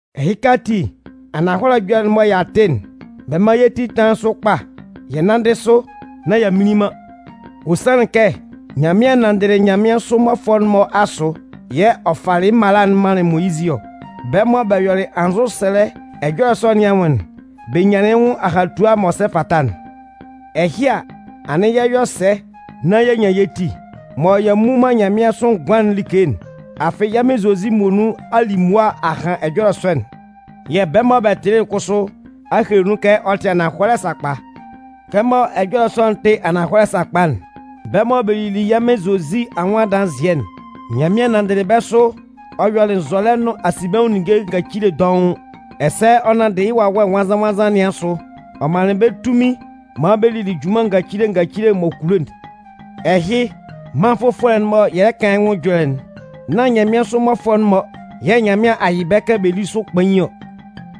Ɛhɩka ati, ananhɔlɛ ɛjɔlɛ'n mɔ y'a tɩ'n, bɛ mán yɛ́ ti tánlan sʋ kpa yɛ nánndɩ sʋ nán y'a mminlin man. Ɔ sanlɩn kɛ Nyanmɩan nanndɩlɩ nyanmɩansʋ mmɔfʋɛ'n-mɔ asʋ yɛ̂ ɔ falɩ mala'n manlɩn Moyizɩ ɔ. Bɛ́ mɔ bɛ yɔlɩ anzʋsɛlɛ ɛjɔlɛ sɔ nɩn anwʋn'n, bɛ nyanlɩn yɩ́ nwʋn ahatua m'ɔ sɛ fata'n. Ɛhɩ a, anɩn yɛ 'yɔ sɛ nán y'a nyan yɛ́ ti, mɔ y'a mmu man nyanmɩansʋ ngʋan'n like'n? Afɩ yɛ́ Mɩn Zozi muonun a li mʋa a han ɛjɔlɛ sɔ'n yɛ̂ bɛ́ mɔ bɛ tɩlɩ'n kʋsʋ a hele kɛ ɔ tɩ ananhɔlɛ sakpa. Kɛmɔ ɛjɔlɛ sɔ'n tɩ ananhɔlɛ sakpa'n, bɛ́ mɔ bɛ lili yɛ́ Mɩn Zozi anwʋn adanzɩɛ'n, Nyanmɩan nanndɩlɩ bɛ́ sʋ ɔ yɔlɩ nzɔlɛ nʋn asinbɛnwʋn ninnge ngacile dɔʋn. Ɛsɛ ɔ nanndɩ yɩ́ Wawɛ Nwannzan-nwannzan nɩn asʋ, ɔ manlɩn bɛ́ tunmin maan bɛ lili junman ngacile ngacile m'ɔ kulo'n. Ɛhɩ, mân fʋfɔlɛ'n mɔ yɛ lɛ kan yɩ́ nwʋn ɛjɔlɛ'n, nán nyanmɩansʋ mmɔfʋɛ'n-mɔ yɛ̂ Nyanmɩan a yɩ bɛ́ kɛ bɛ lí sʋ kpain ɔ.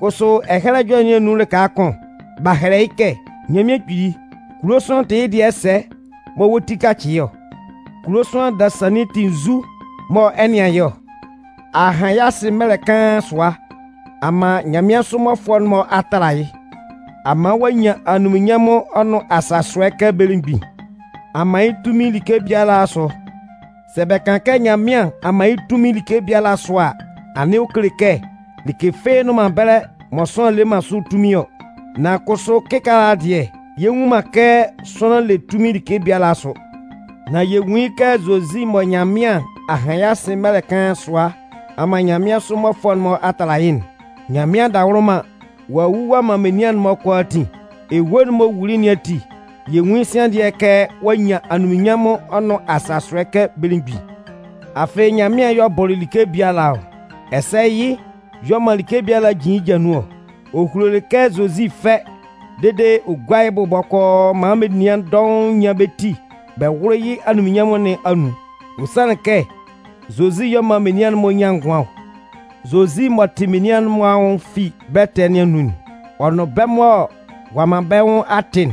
Kʋsʋ Ɛhɛlɛ Ɛjɔlɛ nɩn anun lɩka kʋn, b'a hɛlɛ yɩ́ kɛ: Nyanmɩan Kpili, kulo sʋanlan tɩ yɩ́ dɩɛ sɛ mɔ wɔ́ ti 'kacɩ yɩ́ ɔ? Kulo sʋanlan dasannin tɩ nzu mɔ ɛ 'nɩan yɩ́ ɔ? A han yɩ́ asɩ mɛlɛ kaan sʋa a man nyanmɩansʋ mmɔfʋɛ'n-mɔ a tala yɩ́. A man ɔ'a nyan anunminnyanmʋn ɔ nʋn asasʋɛ kɛ belemgbin. A man yɩ́ tunmin like biala asʋ. Sɛ bɛ kan kɛ Nyanmɩan a man yɩ́ tunmin like biala asʋ a, anɩn ɔ kele kɛ like fɩ́ɩ́ nnʋn ɛbɛlɛ mɔ sʋanlan le man sʋ tunmin ɔ. Nan kʋsʋ kɩkaala dɩɛ, yɛ nnwun man kɛ sʋanlan le tunmin like biala asʋ. Nan yɛ nwun yɩ́ kɛ Zozi mɔ Nyanmɩan a han yɩ́ asɩ mɛlɛ kaan sʋa a man nyanmɩansʋ mmɔfʋɛ'n-mɔ a tala yɩ́'n, Nyanmɩan adawʋlʋman, ɔ'a wu ɔ'a man menian'n-mɔ kʋalaatin. Ewue'n m'ɔ wuli nɩn ati, yɛ nwun yɩ́ sian dɩɛ kɛ ɔ'a nyan anunminnyanmʋn ɔ nʋn asasʋɛ kɛ belemgbin. Afɩ Nyanmɩan y'ɔ bɔlɩ like biala ɔ. Ɛsɛ yɩ́ y'ɔ man like biala jin yɩ́ ja nun ɔ. Ɔ hulolɩ kɛ Zozi fɛ́ dede ɔ gúa yɩ́ bʋ bɔkɔɔ maan menian dɔʋn nyán bɛ́ ti bɛ wʋ́lʋ yɩ́ anunminnyanmʋn nɩn anun. Ɔ sanlɩn kɛ Zozi y'ɔ man menian'n-mɔ nyan ngʋan ɔ. Zozi m'ɔ tɩ menian'n-mɔ anwʋn fi bɛ́ ɛtɛ nɩn anun'n, ɔ nʋn bɛ́ mɔ ɔ'a man bɛ́ nwʋn a tɩ'n,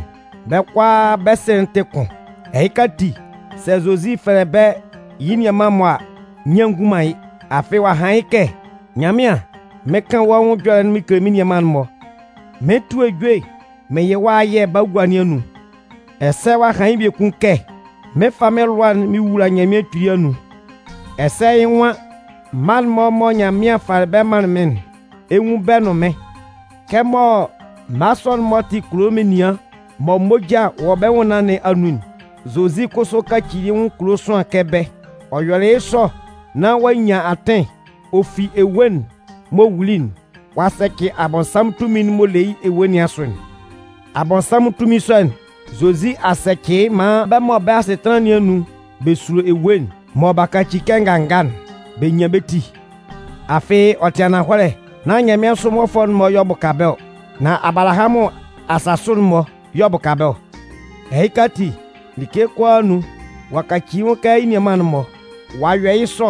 bɛ́ kʋalaa bɛ́ Sɩ'n tɩ kʋn. Ɛhɩka ati, sɛ Zozi fɛlɛ bɛ́ yɩ́ nianman-mɔ a, nyian ngun man yɩ́. Afɩ ɔ'a han yɩ́ kɛ: Nyanmɩan, mɩn 'kan wɔ́ nwʋn ɛjɔlɛ'n mɩn kele mɩ́n nianman'n-mɔ. Mɩn 'tʋ ejue mɩn yɩ wɔ́ ayɛ bagua nɩn anun. Ɛsɛ ɔ'a han yɩ́ biekun kɛ: Mɩn 'fa mɩ́n lʋa'n mɩn wula Nyanmɩan Kpili anun. Ɛsɛ yɩ́ nwan: Mma'n-mɔ mɔ Nyanmɩan falɩ bɛ́ manlɩn mɩ́n'n, ɛ 'nwun bɛ́ nʋn mɩ́n. Kɛmɔ mma sɔ'n-mɔ tɩ kulo menian mɔ moja wɔ bɛ́ nwʋnnaan nɩn anun'n, Zozi kʋsʋ kacili yɩ́ nwʋn kulo sʋanlan kɛ bɛ́. Ɔ yɔlɩ yɩ́ sɔ nán ɔ'a nyan atɩn, ɔ fi ewue'n m'ɔ wuli'n, ɔ'a sɛcɩ Abɔnsanmʋn tunmin'n m'ɔ le yɩ́ ewue nɩn asʋ'n. Abɔnsanmʋn tunmin sɔ'n, Zozi a sɛcɩ yɩ́ maan bɛ́ mɔ bɛ́ asɩtanlan nɩn anun bɛ sulo ewue'n, mɔ b'a kaci kɛ nganga'n, bɛ nyan bɛ́ ti. Afɩ ɔ tɩ ananhɔlɛ, nán nyanmɩansʋ mmɔfʋɛ'n-mɔ y'ɔ bʋka bɛ́ ɔ. Nan Abalahamʋn asasʋ'n-mɔ y'ɔ bʋka bɛ́ ɔ. Ɛhɩka ati, like kʋalaa anun, ɔ'a kaci yɩ́ nwʋn kɛ yɩ́ nianman'n-mɔ. Ɔ'a yɔ yɩ́ sɔ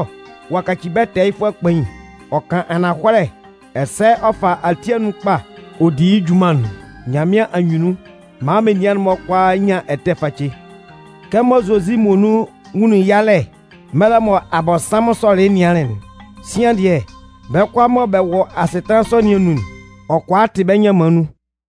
ɔ'a kaci bɛ́ tɛɛyɩfʋɛ kpain. Ɔ kan ananhɔlɛ ɛsɛ ɔ fa ati anun kpa ɔ di yɩ́ junman'n Nyanmɩan anyunnun maan menian'n-mɔ kʋalaa nyan ɛtɛ face. Kɛmɔ Zozi muonun nwunlin yalɛ mɛlɛ mɔ Abɔnsanmʋn sɔlɩ yɩ́ nɩanlɩn'n, sian dɩɛ, bɛ́ kʋalaa mɔ bɛ wɔ asɩtanlan sɔ nɩn anun'n, ɔ kʋala tɩ bɛ́ nyanman nun.